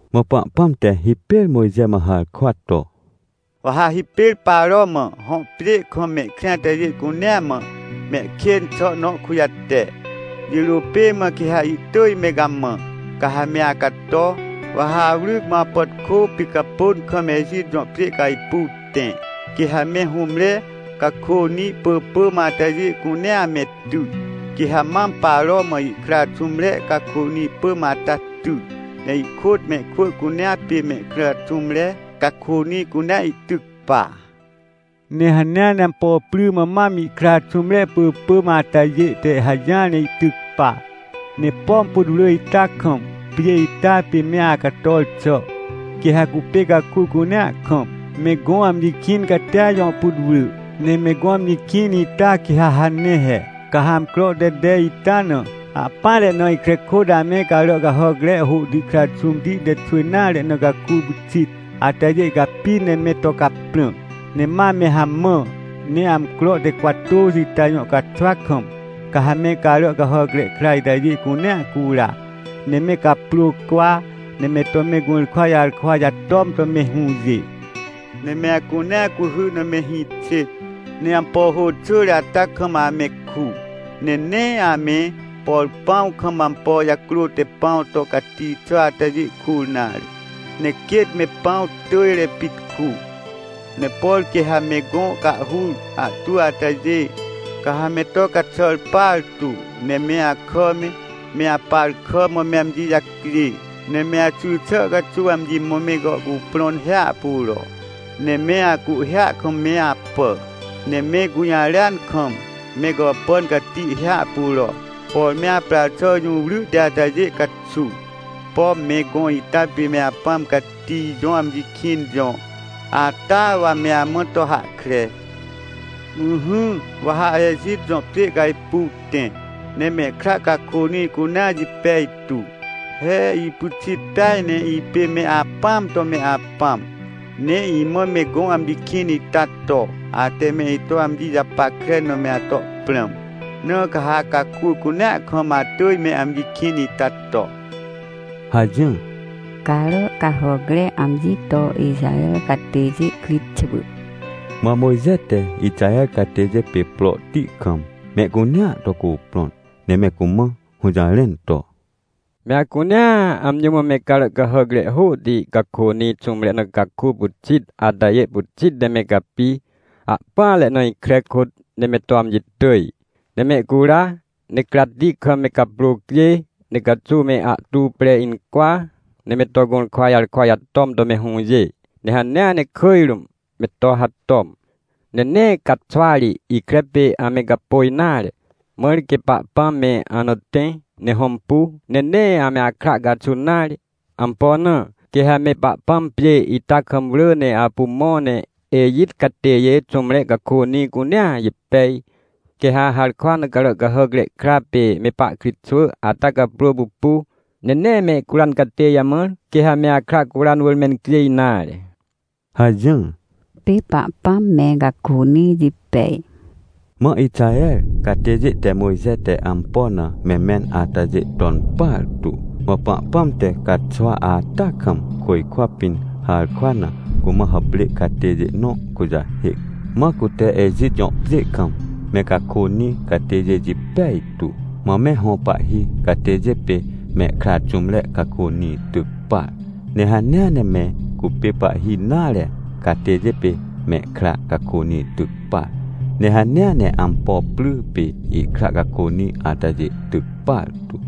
Mã Pahpãm te hipêr Mojxe mã harkwa to: — Wa ha hipêr Paro mã, hõ pjê kam mehkrĩ atajê cuneamã, mehkên xà nõkujate. Jirô pê mã quê ha ihtỳj me gamã, ca ha me acato. Wa ha awryc mãawcapàtkô picapôn kam Ejit jõ pjêcajpuw tẽ, quê ha me hũmre cakônĩ pỳpỳmatajê cunea ame ty. Quê ha mam Paro mã ihkra xũmre cakônĩ pỳmata ty, ne ihkôt mehkwỳ cunea pê mehkra xũmre cakônĩ cunea ihtyc pa. Ne hanea ne ampo pry mã mam ihkra xũmre pỳpỳm atajête hajỹar ne ihtyc pa. — Ne pom putwrỳ ita kam, pjê ita pê me acator xà, quê ha cupê caku cuneakam, me gõ amji kĩn catia jõ putwrỳ, ne me gõ amjikĩn ita quê ha hane he. — Ca ha amcro te tej itana ahpỹanre na ikre kôt ame carà cahàcre hôhti kra xũmti te xwỳ nare nacaku pyxit atajê capi ne me to caprã, ne ma me hamã. Ne amcro te cwatôxiita jõ caxwa kam, ca ha me carà cahàcre kra itajê cunea cura. Ne me caprôcwa, ne me to me gũrkwa jarkwa jatom to me hũjê. — Ne me acunea cuhy na me hĩ xêt, ne ampo hô xỳre ata kam ame ku. Ne nee ame, por pãw kam ampo jacrô te pãw to cati xà atajê kur nare, ne quêt me pãw tỳjre pit ku. Ne por quê ha me gõ cahhur ahtwỳatajê, ca ha me to caxàr partu. Ne me akà me, me aparkàmã me amji jacjê, ne me axy xà caxuw amji mã me gàhcuprõn hiahpuro, ne me acuhhêa kam me apà. Ne me gũjarêan kam, megàpàn cati hiahpuro, por me aprar xàjũwryhti atajê caxuw. Pom me gõ ita pême Apãm Cati jõ amji kĩn jõ, atawa me amã to hahkre. — Ỹhỹ, wa ha Ejit jõ pjê cajpuw tẽ, nemehkra cakônĩ cunea jipej tu. He, ipyxit peaj ne ipême Apãam to me Apãm, ne imãme gõ amji kĩn ita to, ate me ito amji japackre na me atoprãm. Na ca ha caku cunea kam atỳj me amji kĩn ita to — hajỹr. Carà cahàcre amji to Ixaher catêjê kritxwỳ Mã Mojxe te Ixaher catêjê pê prohti kam mehcunea to cuprõn ne me cumã hũjarẽn to: — Me acunea amji mã me carà cahàcre hôhti cakônĩ xũmre na caku pyxit atajêpyxit ne me capi, ahpỹanre na ikre kôt, neme to amji tỳj. Ne mehcura, ne cratti kam me caprôcjê, ne caxuw me ahtu pre incwa, neme to gũrkwa jarkwa jatom to mehũjê, ne hanea ne kỳj rũm me to hatom. Ne nee caxwa ri ikre pêame gapôj nare, mãr quê Pahpãm me ana tẽ, ne hõmpu, nenee ame akra caxun nare. Ampo na? Quê ha me Pahpãm pjê ita kam wrỳ ne apu mõ, ne Ejitcatêjê xũmre cakônĩ cunea jipej. Quê ha harkwa na carà cahàcre kra pême pahkritxwỳ ata caprô pupu, ne nee mehcuran catê jamãr, quêha me akra curan wỳr mencjêj nare — hajỹr. Pê Pahpãm me cakônĩ jipej Mã Ixaher catêjê te Mojxe te ampo na me mẽn atajê ton partu. MãPahpãm te caxwa ata kam côjkwapĩn harkwa na cumã hàprê catêjê nõ kujahêc, mãcute Ejit jõpjê kam me cakônĩ catêjê jipej tu. Mã me hõ pahhi catêjê pê mehkra xũmre cakônĩ tyc par. Ne hanea ne me cupê pahhi nare catêjêpê mehkra cakônĩ tyc par. Ne hanea ne ampo pry pê ihkra cakônĩ atajê tyc partu.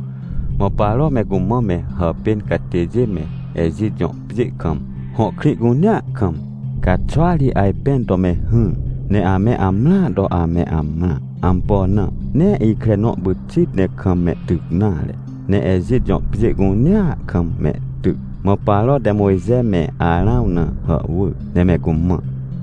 Mã Paro me cumã me hàpên catêjê meEjit jõ pjê kam, hõ krĩ cunea kam, caxwa ri ajpẽn to me hỹr, ne ame amrãa to ameamrã. Ampo na? Nee ikrenõ pyxit ne kam mehtyc nare, ne Ejit jõ pjê cunea kam mehtyc. Mã Paro te Mojxe me Arãw na hàhwỳr ne me cumã: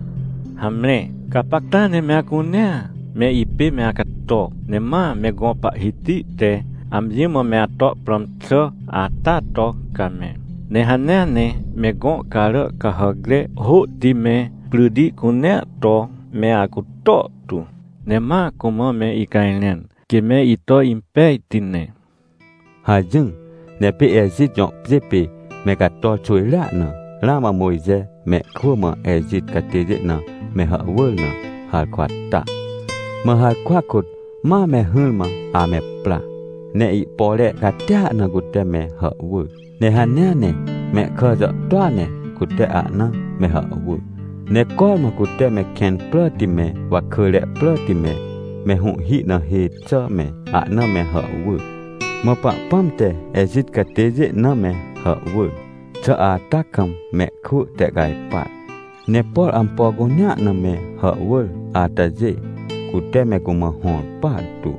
— Hamre! Gapacta ne me acunea me ipê me acato! Ne ma me gõ Pahhiti teamji mã meato prãm xà ata to, ca me. Ne hanea ne me gõ carà cahàcre hôhti me, pryti cunea to me acuto tu, ne ma cumã me icajrẽn, quê me ito impejtine — hajỹr. Ne pê Ejit jõ pjê pê me cator xwỳjrea na, ramã Mojxe mehkwỳmã Ejit catêjê na me hàhwỳr na, harkwa ta. Mã harkwa kôt mame hỹrmã ame pra, ne ihpore catia na cute me hàhwỳr, ne hanea nemehkà jàhtôa ne cute ahna me hàhwỳr, ne cormã cute me kẽn pràti me, wakỳre pràti me, me hũhhi na hê xà me, ahna me hàhwỳr. Mã Pahpãm te Ejit catêjê name hàhwỳr xà ata kam mehkwỳ tehcajpar, ne por ampo cunea na me hàhwỳratajê, cute me cumã hõr partu.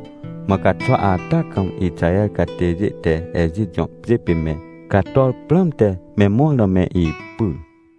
Mã caxwa ata kam Ixaher catêjê te Ejitjõ pjê pê me cator prãmte me mõr na me ipyr.